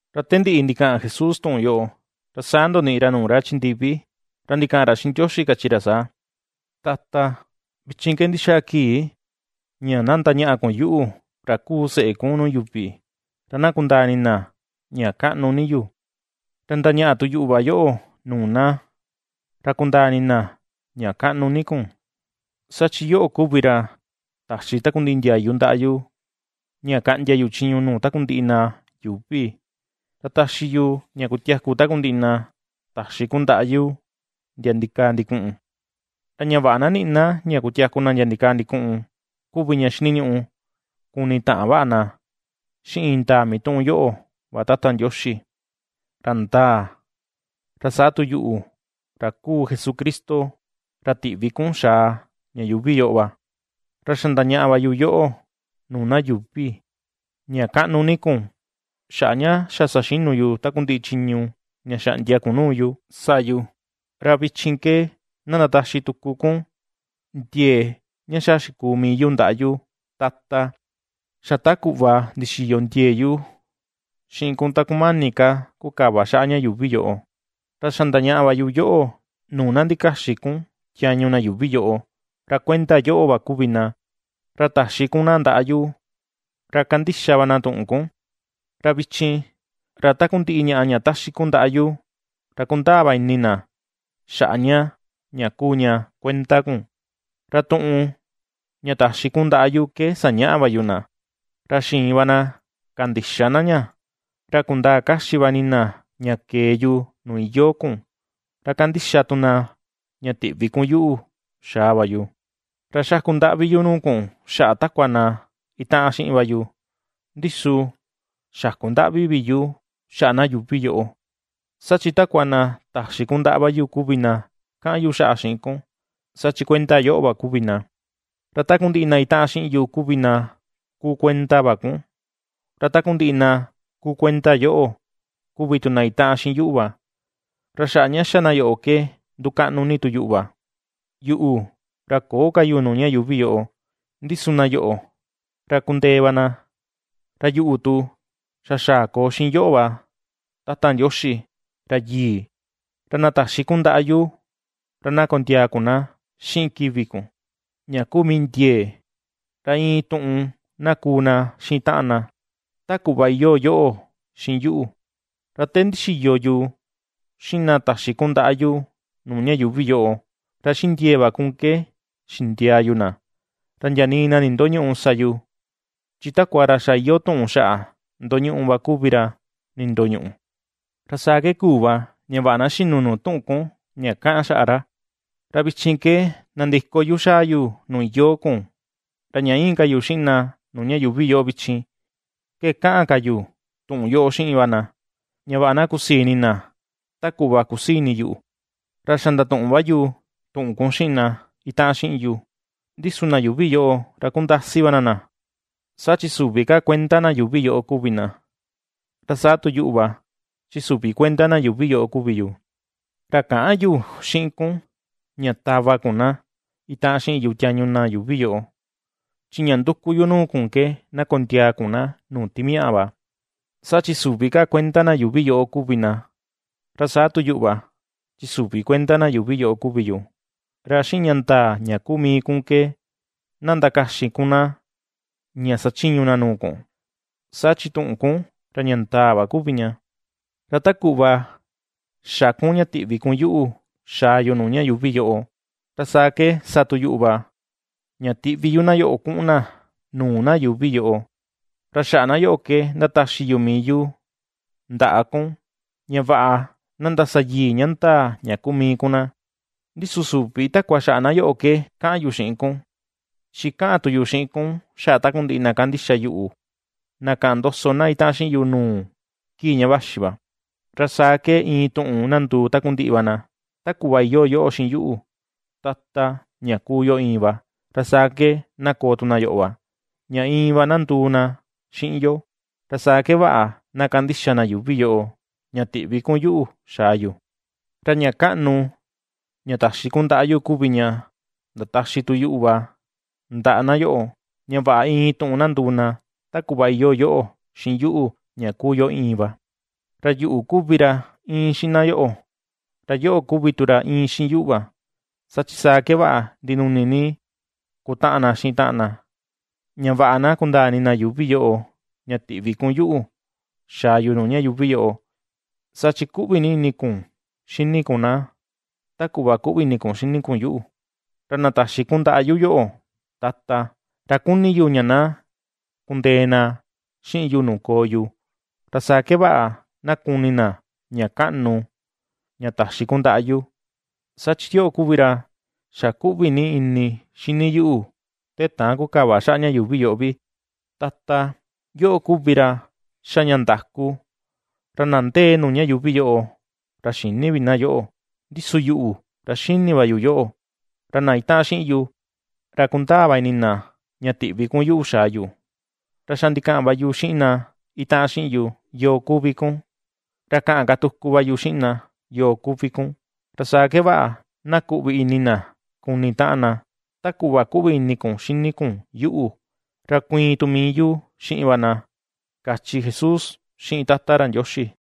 Ra te ndiꞌi ndikaꞌan Jesús tuꞌun yoꞌo, ra saa ndoniꞌi ra nuu ra chi ndivi, ra ndikaꞌan ra xiꞌin Ndioxi kachi ra saa: ―Tata, vichin ke ndixaa kii ña na ndañaꞌa kun yuꞌu, ra kuu seꞌe kun nuu yuvi ra na kundaa ini na ña kaꞌnu ni yu, ra ndañaꞌa tu yuꞌu va yoꞌo nuu na, ra kundaa ini na ña kaꞌnu ni kun. Saa chi yoꞌo kuvi ra taxi takundiꞌi ndiayu ndaꞌa yu, ña kaꞌndia chiñu yu nuu takundiꞌi na yuuvi, ra taxi yu ña kutiaku takundiꞌi na taxi kun ndaꞌa yu ndia ndikaa ndikuꞌun. Ra ña vaꞌa na niꞌi na ña kutiaku na ndia ndikaa ndikuꞌun, kuvi ña xiniñuꞌu kuni taꞌan vaꞌa na xiꞌin indaa mituꞌun yoꞌo va Tata Ndioxi, ra ndaa, ra saa tu yuꞌu, ra kuu Jesucristo ra tiꞌvi kun xaa ña yuuvi yoꞌo va. ’Ra xa ndañaꞌa va yu yoꞌo nuu na yuuvi ña kaꞌnu ni kun, xaꞌa ña xa saxinu yu takundiꞌi chiñu ña xaꞌndia kun nuu yu sa yu. Ra vichin ke na ndataxi tuku kun ndiee ña xa xikuu mii yu ndaꞌa yu, Tata, xa ta kuꞌva ndixiyo ndiee yu xiꞌin kun ta kumani ka kukava xaꞌa ña yuuvi yoꞌo. ’Ra xa ndañaꞌa va yu yoꞌo, nuu na ndakaxin kun tiañu na yuuvi yoꞌo, ra kuenda yoꞌo va kuvi na, ra taxi kun na ndaꞌa yu, ra ^kandixa va na tuꞌun kun. Ra vichin, ra takundiꞌi ñaꞌa ña ^taxi kun ndaꞌa yu, ra ^kundaa va ini na xaꞌa ña ña kuu ña kuenda kun. Ra tuꞌun ña taxi kun ndaꞌa yu ke sañaꞌa va yu na; ra xiin va na kandixa na ña, ra kundaa kaxi va ini na ña kee yu nuu iyoo kun, ra ^kandixa tu na ña tiꞌvi kun yuꞌu xaa va yu. ’Ra xaku ndaꞌvi yu nuu kun xaꞌa takua na itaꞌan xiꞌin va yu, ndi su xäku ndaꞌvi vi yu xaꞌa na yuuvi yoꞌo, saa chi takua na taxi kun ndaꞌa va yu kuvi na kaꞌan yu xaꞌa xiꞌin kun; saa chi kuenda yoꞌo va kuvi na. Ra takundiꞌi na itaꞌan xiꞌin yu kuvi na kuu kuenda va kun, ra takundiꞌi na kuu kuenda yoꞌo, kuvi tu na itaꞌan xiꞌin yuꞌu va; ra xaꞌa ña xa na yoꞌo ke ndukaꞌnu ni tu yuꞌu va. ’Yuꞌu, ra köo ka yu nuu ña yuuvi yoꞌo, ndi su na yoꞌo, ra kundee va na, ra yuꞌu tu xa xaa koo xiꞌin yoꞌo va Tata Ndioxi, ra yii. Ra na taxi kun ndaꞌa yu, ra na kondiaa kun na xiꞌin kivi kun, ña kuu mii ndiee, ra iin tuꞌun na kuu na xiꞌin taꞌan na, ta kuꞌva iyoo yoꞌo xiꞌin yuꞌu. Ra te ndixiyo yu xiꞌin na taxi kun ndaꞌa yu nuu ña yuuvi yoꞌo, ra xiꞌin ndiee va kun ke xindiaa yu na; ra ndia nii na nindoñüꞌu sa yu, chi takua ra xa iyoo tuꞌun xaꞌa ndoñuꞌu va kuvi ra nindoñuꞌu, ra saa ke kuu va ña vaꞌa na xinu nuu tuꞌun kun ña kaꞌan xaꞌa ra. ’Ra vichin, ke nandiko yu xaa yu nuu iyoo kun, ra ña íin ka yu xiꞌin na nuu ña yuuvi yoꞌo vichin, ke kaꞌan ka yu tuꞌun yoꞌo xiꞌin va na, ña vaꞌa na kusii ini na ta kuꞌva kusii ini yuꞌu. Ra xa ndatuꞌun va yu tuꞌun kun xiꞌin na itaꞌan xiꞌin yu, ndi su na yuuvi yoꞌo ra kundasi va na na, saa chi süvi ka kuenda na yuuvi yoꞌo kuvi na, ra saa tu yuꞌu va chi süvi kuenda na yuuvi yoꞌo kuvi yu. Ra käꞌan yu xiꞌin kun, ña tava kun na itaꞌan xiꞌin yu tiañu na yuuvi yoꞌo, chi ña nduku yu nuu kun ke na kondiaa kun na nuu timaꞌa va. Saa chi süvi ka kuenda na yuuvi yoꞌo kuvi na, ra saa tu yuꞌu va chi süvi kuenda na yuuvi yoꞌo kuvi yu. Ra xiꞌin ña ndaa ña kuu mii kun ke, na ndakaxin kun na, ña sachiñu na nuu kun, saa chi tuꞌun kun ra ña ndaa va kuvi ña. Ra ta kuꞌva xa kun ña tiꞌvi kun yuꞌu xaa yu nuu ña yuuvi yoꞌo, ra saa ke sa tu yuꞌu va, ña tiꞌvi yu na yoꞌo kuꞌun na nuu na yuuvi yoꞌo. Ra xaꞌa na yoꞌo ke ^ndataxi yu mii yu ndaꞌa kun, ña vaꞌa na ndasayii ña ndaa ña kuu mii kun na. ’Ndi su süvi takua xaꞌa na yoꞌo ke kaꞌan yu xiꞌin kun, chi ^kaꞌan tu yu xiꞌin kun xaꞌa takundiꞌi na kandixa yuꞌu, na kaꞌan ndoso na itaꞌan xiꞌin yu nuu, kii ña vaxi va. Ra saa ke, iin tuꞌun na nduu takundiꞌi va na, ta kuꞌva iyoo yoꞌo xiꞌin yuꞌu, Tata, ña kuu yo iin va, ra saa ke na koo tu na yoꞌo va, ña iin va na nduu na xiꞌin yo. Ra saa ke vaꞌa na kandixa na yuuvi yoꞌo, ña tiꞌvi kun yuꞌu xaa yu. Ra ña kaꞌnu, ña taxi kun ndaꞌa yu kuvi ña ndataxi tu yuꞌu va ndaꞌa na yoꞌo, ña vaꞌa iin tuꞌun na nduu na, ta kuꞌva iyoo yoꞌo xiꞌin yuꞌu, ña kuu yo iin va. Ra yuꞌu kuvi ra íin xiꞌin na yoꞌo, ra yoꞌo kuvi tu ra íin xiꞌin yuꞌu va, saa chi saa ke vaꞌa ndinuni ni kutaꞌan na xiꞌin taꞌan na, ña vaꞌa na kundaa ini na yuuvi yoꞌo, ña tiꞌvi kun yuꞌu, xaa yu nuu ña yuuvi yoꞌo, saa chi ^kuꞌvi ni ini kun xini kun na, ta kuꞌva ^kuꞌvi ini kun xini kun yuꞌu. ’Ra na taxi kun ndaꞌa yu yo̱ꞌo̱, Tata, ra kuni yu ña na kundee na xiꞌin yu nuu koo yu, ra saa ke vaꞌa na kuni na ña kaꞌnu, ña taxi kun ndaꞌa yu; saa chi yoꞌo kuvi ra xa kuꞌvi ni ini xini yuꞌu te täan kukava xaꞌa ña yuuvi yoꞌo vi. Tata, yoꞌo kuvi ra ^xa ña ndaku, ra na ndee nuu ña yuuvi yoꞌo, ra xïni vi na yoꞌo, ndi su yuꞌu, ra xini va yu yoꞌo, ra na itaꞌan xiꞌin yu, ra kundaa va ini na ña tiꞌvi kun yuꞌu xaa yu. Ra xa ndikaꞌan va yu xiꞌin na itaꞌan xiꞌin yu, yoo kuvi kun, ra kaꞌan ka tuku va yu xiꞌin na, yoo kuvi kun, ra saa ke vaꞌa na kuꞌvi ini na kuni taꞌan na ta kuꞌva kuꞌvi ini kun xini kun yuꞌu, ra kuiin tu mii yu xiꞌin va na ―kachi Jesús xiꞌin Tata ra Ndioxi.